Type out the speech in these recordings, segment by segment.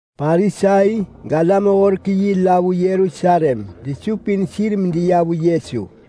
Parisai galam-horek-yi la vu Yerusalem desupin sir medeya vu Yesu.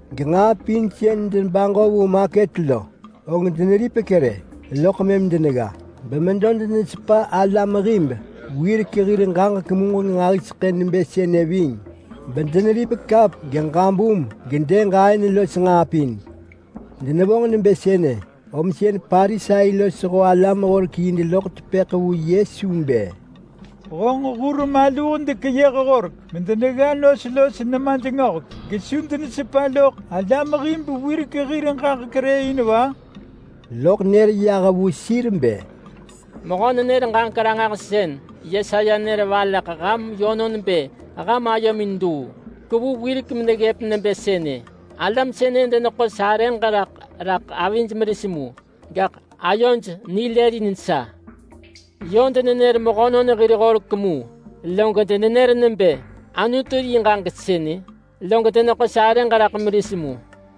Genġaa pin sën debaġo vu maket lo, og deneripek rë, loḳ mëm denegga. Gemedo denesepa alam hib wirek hir ġaġek muġeng nġahiseḳë nebë sënë ving, bedeneripek kap geġabum gedëg aën los nġaa pin. Denevonġ nebë sënë, om sën Parisai losho alam-horek-yi deloḳ tepëḳ vu Yesu bë, “Honġ hur maluh dekeyëh horek medenegga nos los nemaj nipaya gesu denesepa loḳ alam hib wirek hir ġaġek rë in va?” Lob nër yah vu sir bë, “Mehö-nenër-ġaġek-ranġahsën Yesaya nër valeḳ ham yönon bë ham ayomin luu. Kevu wirek meneggëp nebë sënë: ‘Alam sënë deneḳo sarëġ raḳ rak avij meris mu, gaḳ ayoj nilëlin sa. Yö denenër mehönon hir horek mu, log denenër nebë “Anutu yi ġaġek sënë!” Log deneḳo sarëġ raḳ meris mu.’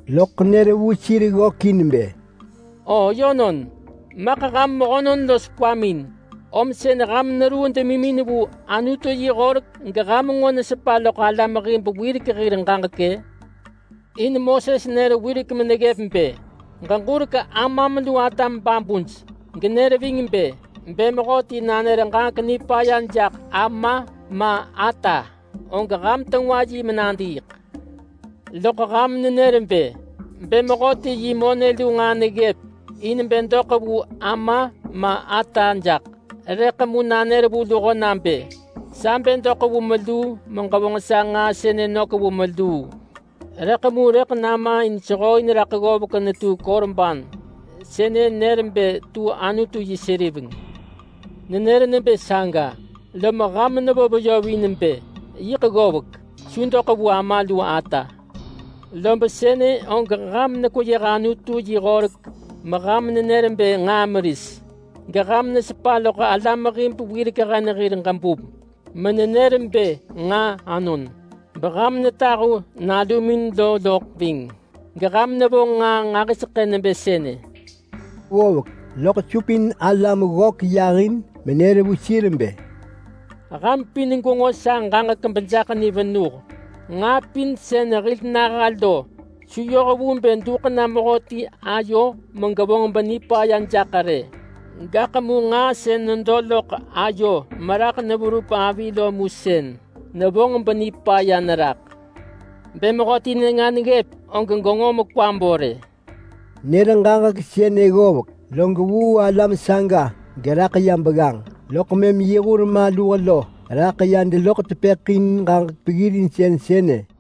Loḳ nër vu sir ggökin bë, “O yönon! Maḳ ham mehönon los kwamin, om sën ham neruu demimin vu Anutu yi horek geham nġo nesepa loḳ alam hib wirek hir ġaġek-ë? In Moses nër wirek meneggëp bë, ‘Ġeġurek amam lu atam babuj!’ genër ving bë, ‘Bë mehöti nanër ġaġek nipaya jaḳ ama ma ata, og ham tengwa yi menadiiḳ.’ Loḳ ham nenër bë, ‘Bë mehöti yi monë lu nġaa neggëp in bë doḳ vu ama ma ata jaḳ, rëḳ mu nanër vu luho nabë, “Sa bë doḳ vu meluu meġevonġ sa nġaa sënë nök vu meluu, rëḳ mu rëḳ nama in sehooin raḳ ggovek netu Korban (sënë nër bë tu Anutu yi seriveng).” ’ Nenër nebë saga, lob ham nevo veyovin bë, ‘Yiḳ ggovek, su doḳ vu ama lu ata!’ Lob sënë og ham nekweyëh Anutu yi horek meham nenër bë nġaa meris, geham nesepa loḳ alam hib wirek hen hir ġaġek menenër bë nġaa anon. Beham netahu nalumin lo loḳ ving. Geham nevonġ nġaa nġahiseḳë nebë sënë.” Ggovek, loḳ supin alam ggök yahin menër vu sir bë, “Ham pin gwenġo sa ġaġek bejaḳ ni venuh! Nġaa pin sën hil naha lo su yoh vu bë duḳ na mehöti ayo megevonġ benipaya jaḳ rë. Gaḳ mu nġaa sën nedo loḳ ayo meraḳ neverup avi lo mu sën nevonġ benipaya neraḳ. [Bë mehöti nenga neggëp og genġo mekwa bo rë!]” Nër ġaġek sënë ggovek, log vuu alam saga geraḳ ya begganġ, loḳ mëm yi hur maluh ya deloḳ tepëḳ vu yi in ġaġek peggirinsën sënë.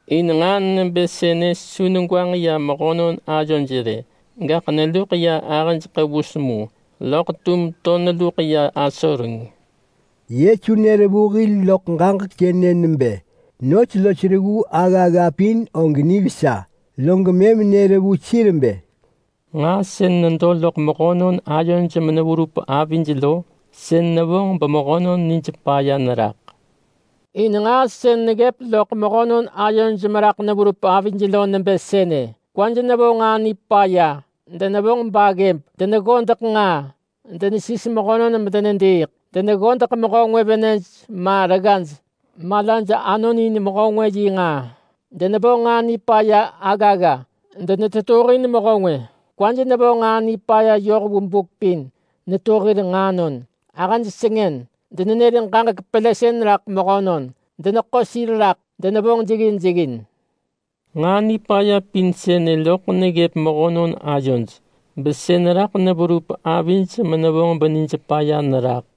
In nġaa nebë sënë su negwanġ ya mehönon ayoj rë, gaḳ neluḳ ya ahëj ḳevus mu, loḳ tum to neluḳ ya asoreng.” Yesu nër vu hil loḳ ġaġek sënë nebë nos los reggu aggagga pin og nivesa. Log mëm nër vu sir bë, “Nġaa sën nedo loḳ mehönon ayoj meneverup avij lo, sën nevonġ bemehönon nij paya neraḳ. In nġaa sën neggëp loḳ mehönon ayoj meraḳ neverup avij lo nebë sënë: Kwaj nevo nġaa nipaya, denevonġ baggëb, deneggodeḳ nġaa, denesis mehönon medenediiḳ, deneggodeḳ mehö ngwë venëj ma reggaj, malaj anonin mehö ngwë yi nġaa, denevonġ nġaa nipaya aggagga, denetetuhin mehö ngwë, kwaj nevo nġaa nipaya yoh vu buk pin netu hir nġaanon, ahëj sengën, denenër ġaġek pelësën raḳ mehönon, deneḳo sir raḳ, denevonġ jeggin jeggin. Nġaa nipaya pin sënë loḳ neggëp mehönon ayoj, besën raḳ neverup avij menevonġ benij paya neraḳ.”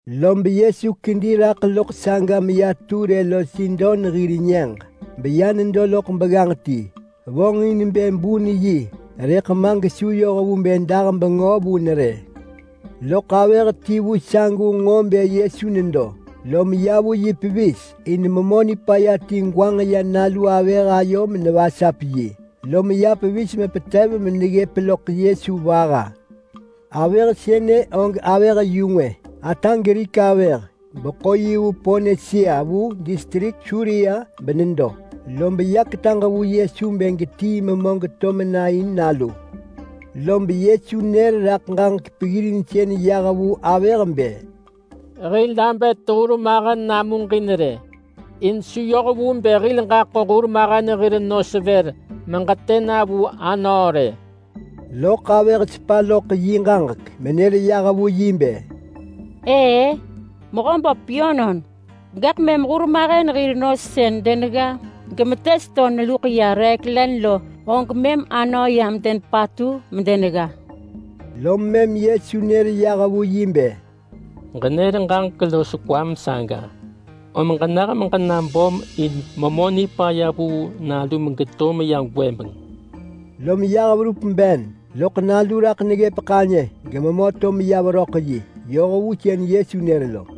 Lob Yesu kedi raḳ loḳ saga meya Ture los Sidon hir nyëġ, beya nedo loḳ begganġ ti. Vonġin bë bun yi, rëḳ ma gesu yoh vu bë dah bengö vun rë. Loḳ avëh ti vu sagu nġo bë Yesu nedo, lom ya vu yi pevis. In memö nipaya ti gwanġ ya nalu avëh ayo menevonġ yi, lom ya pevis mepetev meneggëp loḳ Yesu vaha. Avëh sënë og avëh yu ngwë, ata Grik avëh beḳo yi vu Ponisia vu distrik Suria benedo, lob ya ketaġ vu Yesu bë getii memö geto mena in nalu. Lob Yesu nër raḳ ġaġek peggirinsën yah vu yi bë, “Hil abet hurmahen namuġin rë, in su yoh vu bë hil ġaḳo hurmahen hir nos vër meġetë na vu anöö rë!” Loḳ avëh sepa loḳ yi ġaġek menër yah vu yi nebë, “Ëë-ë, Mehöböp yönon! Gaḳ mëm hurmahen hir nos sën denegga gemetes to neluḳ ya reek len lo, og mëm anöö yam denepatu medenegga.” Lom mëm Yesu nër yah vu yi bë, “Ġenër ġaġek los kwam saga, om ġenah meġena böm in memö nipaya vuu nalum geto meya gwëbeng!” Lom yah meya ben genalu raḳ neggëp ḳanyë gememö to meya veröḳ yi yoh vu sën Yesu nër lo.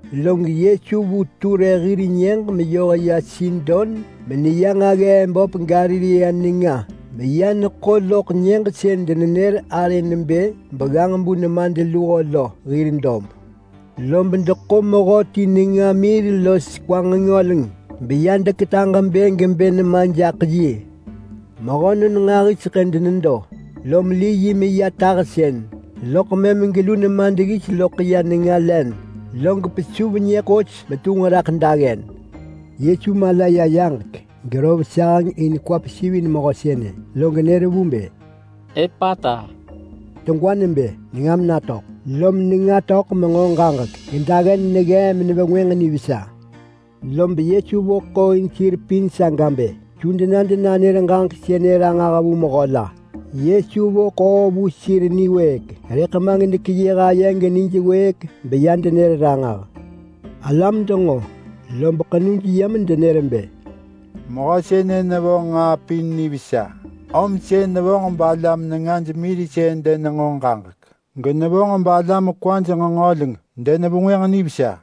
Lob Yesu vu Ture hir nyëġ meyoh ya Sidon meneya nġaggee böp Galilea nenga meya neḳo loḳ nyëġ sën denenër arë nebë Begganġ-bu-nemadluho lo hir dob. Lob deḳo mehöti nenga mir gekwa nġengöleng bedeya vu yi medeketaġ bë gebë nema jaḳ yi. Mehönon nġahiseḳë denedo saga, lom li yi meya nenga tahsën, loḳ mëm gelu nema deggis loḳ ya mehö lo nenga len, log pesuv nyë ḳos metunġ raḳ daggen. Yesu mala ya yaġek gerov saheng in kwa pesivin mehö sënë lo, log nër vu bë, “Epata!” (Degwa nebë “Nengam natöḳ!”). Lom nenga töḳ menġo ġaġek gedaggen neggee menevengwënġ nivesa. Lob mëm Yesu vo ḳoo vu sir pin saga bë su dena denanër ġaġek sënë ranġah vu mehö la. Yesu vo ḳoo vu sir niwëëk, rëḳ ma gedekeyëh aye genij wëëk beya denër ranġah. Alam denġo lob ḳenuj ya rot medenër bë, “Mehö sënë nevonġ nġaa pin nivesa. Om sën nevonġ balam nengaj mirsën denenġo ġaġek, genevonġ balam kwaj nġengöleng denevengwënġ nivesa.”